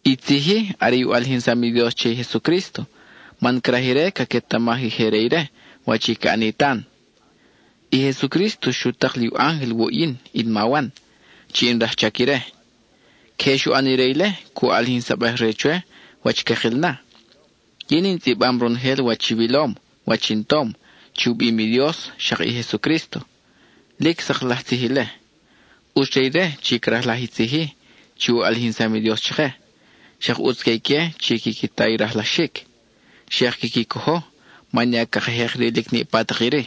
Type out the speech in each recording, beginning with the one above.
I tzij-i are i u ʼalijinsam i Dios che i Jesucrísto, man craj ire caquetamaj i je re ire wach i ca ʼani tan. I Jesucrísto xu tak li u ángel wuʼ yin, in ma Wan, chi in rajchac ire. Queje xu ʼan ire ile, cu ʼalijinsabej re chwe wach cakil na. Yin in tzʼibam ronojel wach i wilom, wach in tom, chi u bim i Dios, xak i Jesucrísto; lic sak laj tzij ile. ʼUtz re ire chi crajlaj i tzij-i chi u ʼalijinsam i Dios chake, xak ʼutz que ique chi quiqui ta i rajlaxic, xak quiqui cojo, man ya caka jek rilic niʼpa tak iri.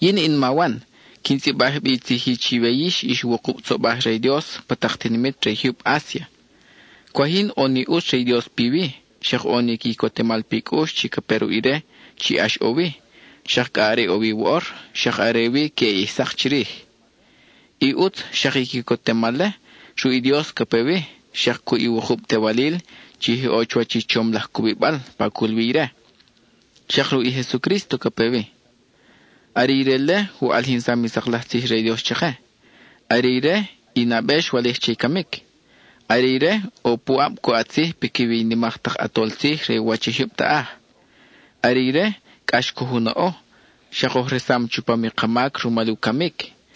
Yin in ma Wan, quin tzʼibaj bi i tzij-i chiwe yix ix wukub tzobaj re i Dios pa tak tinimit re i jyub Asia. Cwaj yin ʼo ni ʼutz re i Dios piwi, xak ʼo ni quicotemal pi cʼux chi ca pe ruʼ ire chi ʼax ʼo wi, xak cʼa are ʼo wi woʼor, xak are wi queʼe ʼij sak chirij. I ʼutz, xak i quicotemal-le, ruʼ i Dios ca pe wi, xak cuʼ i wukub tewalil chi je ʼo chuwach i chom laj cubibal, pa cul wi ire; xak ruʼ i Jesucrísto ca pe wi. Are ire-le u ʼalijinsam i sak laj tzij re i Dios chake; are ire i nabe xwalij che i camic; are ire ʼo puʼab cu ʼat tzij piquiwi i nimak tak ʼatol tzij re u wach i jyub taʼaj. Are ire, cʼax coj u naʼo, xak oj resam chupam i ka mac rumal u camic.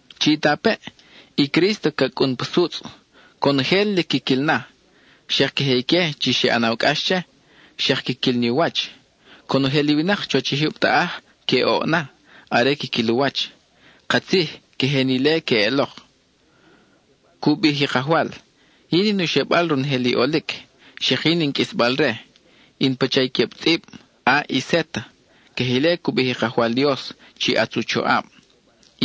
¡Chitapeʼ, i Crísto ca cʼun pa sutzʼ! Conojel lic quiquil na; xak queje ique chi xe ʼanaw cʼax che, xak quiquil ni u wach. Conojel i winak chuwach i jyub taʼaj que oʼ na, are quiquil u wach. Katzij, queje ni ile queʼelok. Cu bij i Kajwal: “Yin in u xebal ronojel i ʼolic, xak yin in qʼuisbal-re. In pacha i queb tzʼib A y Z.” Queje ile cu bij i Kajwal Dios chi ʼatz u choʼab,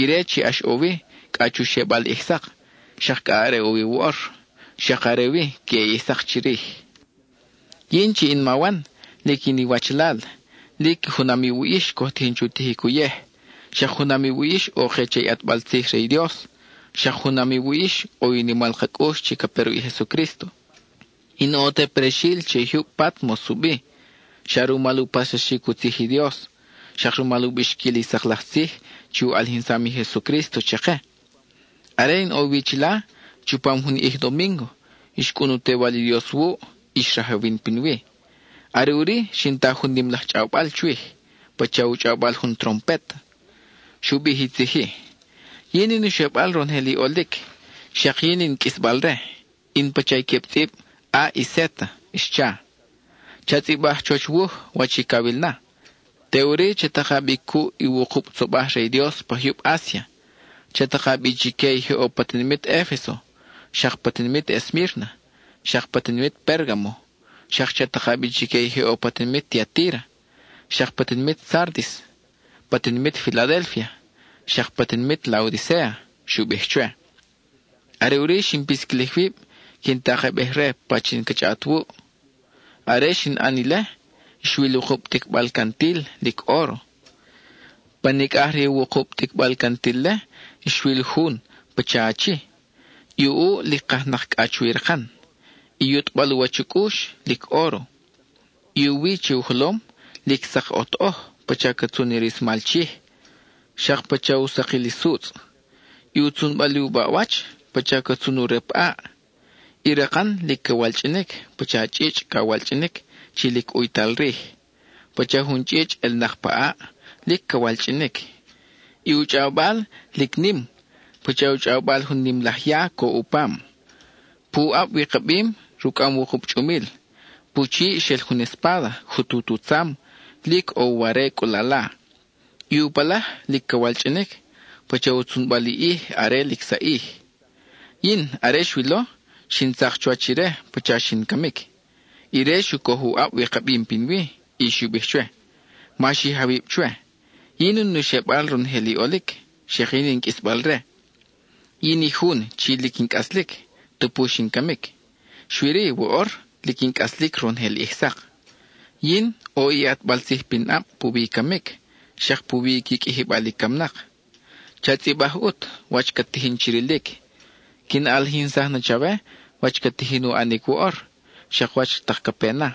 ire chi ʼax ʼo wi cʼa chu xebal ʼij sak, xak cʼa are ʼo wi woʼor, xak are wi queʼe ʼij sak chirij. Yin, chi in ma Wan, lic in iwachalal; lic junam iwuʼ yix coj tijin chu tijic uyej; xak junam iwuʼ yix ʼo ke che i ʼatbal tzij re i Dios; xak junam iwuʼ yix ʼo i u nimal ka cʼux chi ca pe ruʼ i Jesucrísto. In ʼo te prexil che i jyub Pátmos u bi, xa rumal u paxsaxic u tzij i Dios, xak rumal u bixquil i sak laj tzij chi u ʼalijinsam i Jesucrísto chake. Are in ʼo wi chila, chupam jun domíngo xcʼun u Tewal i Dios wuʼ, y xrajawin pinwi. Are ʼuri, xin ta jun nim laj chʼawbal chwij, pacha u chʼawbal jun trompet. Xu bij i tzij-i: —Yin in u xebal ronojel i ʼolic, xak yin in qʼuisbal-re; in pacha i queb tzʼib A y Z —xcha—. Cha tzʼibaj chuwach wuj wach i cawil na, teʼuri cha taka bi cuʼ i wukub tzobaj re i Dios pa jyub Asia. Cha taka bi chique i je ʼo pa tinimit Efeso, xak pa tinimit Esmírna, xak pa tinimit Pérgamo, xak cha taka bi chique i je ʼo pa tinimit Tiatíra, xak pa tinimit Sárdis, pa tinimit Filadélfia, xak pa tinimit Laodicéa —xu bij chwe. Are ʼuri xin pisquilij wib, quin takejbej-re pachin ca chʼaʼat wuʼ. Are xin ʼan ile, xwil wukub ticbal cantil, lic óro. Pa nicʼaj re i wukub ticbal cantil-le, xwil jun, pacha achi; i u ʼuʼ lic kajnak cʼa chuwi rakan; i yutʼbal u wach u cʼux, lic óro. I u wi che u jolom, lic sak ʼotoʼoj, pacha ca tzun i rismal chij, xak pacha u sakil i sutzʼ. Y u tzunbal i u baʼwach, pacha ca tzun u rep ʼaʼ. I rakan lic ca walchʼinic, pacha chʼichʼ ca walchʼinic chi lic ʼuytal rij; pacha jun chʼichʼ ʼelnak pa ʼaʼ, lic ca walchʼinic. I u chʼawbal, lic nim, pacha u chʼawbal jun nim laj ya coʼ u pam. Pu ʼab wikabim, rucʼam wukub chʼumil. Pu chiʼ xel jun espáda, jutut u tzam, lic ʼo u ware cʼulala. I u palaj, lic ca walchʼinic, pacha u tzunbal i ʼij are lic saʼij. Yin, are xwilo, xin tzak chuwach ire pacha xin camic. Ire xu coj u ʼab wikabim pinwi, y xu bij chwe: —Ma xij awib chwe; yin in u xebal ronojel i ʼolic, xak yin in qʼuisbal-re. Yin i jun chi lic in cʼaslic, tupu xin camic; xui-ri woʼor, lic in cʼaslic ronojel ʼij sak. Yin, ʼo i ʼatbal tzij pinʼab puwi i camic, xak puwi i qui qʼuijibal i camnak. Cha tzʼibaj ʼut, wach cat tijin chi rilic; quin ʼalijinsaj na chawe wach ca tijin u ʼanic woʼor, xak wach tak ca pe na.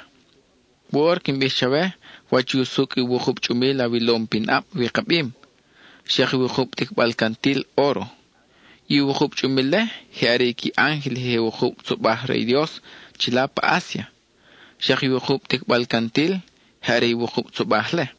Woʼor quin bij chawe wach usucʼ i wukub chʼumil awilom pin ʼab wikabim, xak i wukub ticbal cantil óro. I wukub chʼumil-le, je are qui ángel i je wukub tzobaj re i Dios chila pa Asia. Xak i wukub ticbal cantil, je are i wukub tzobaj-le.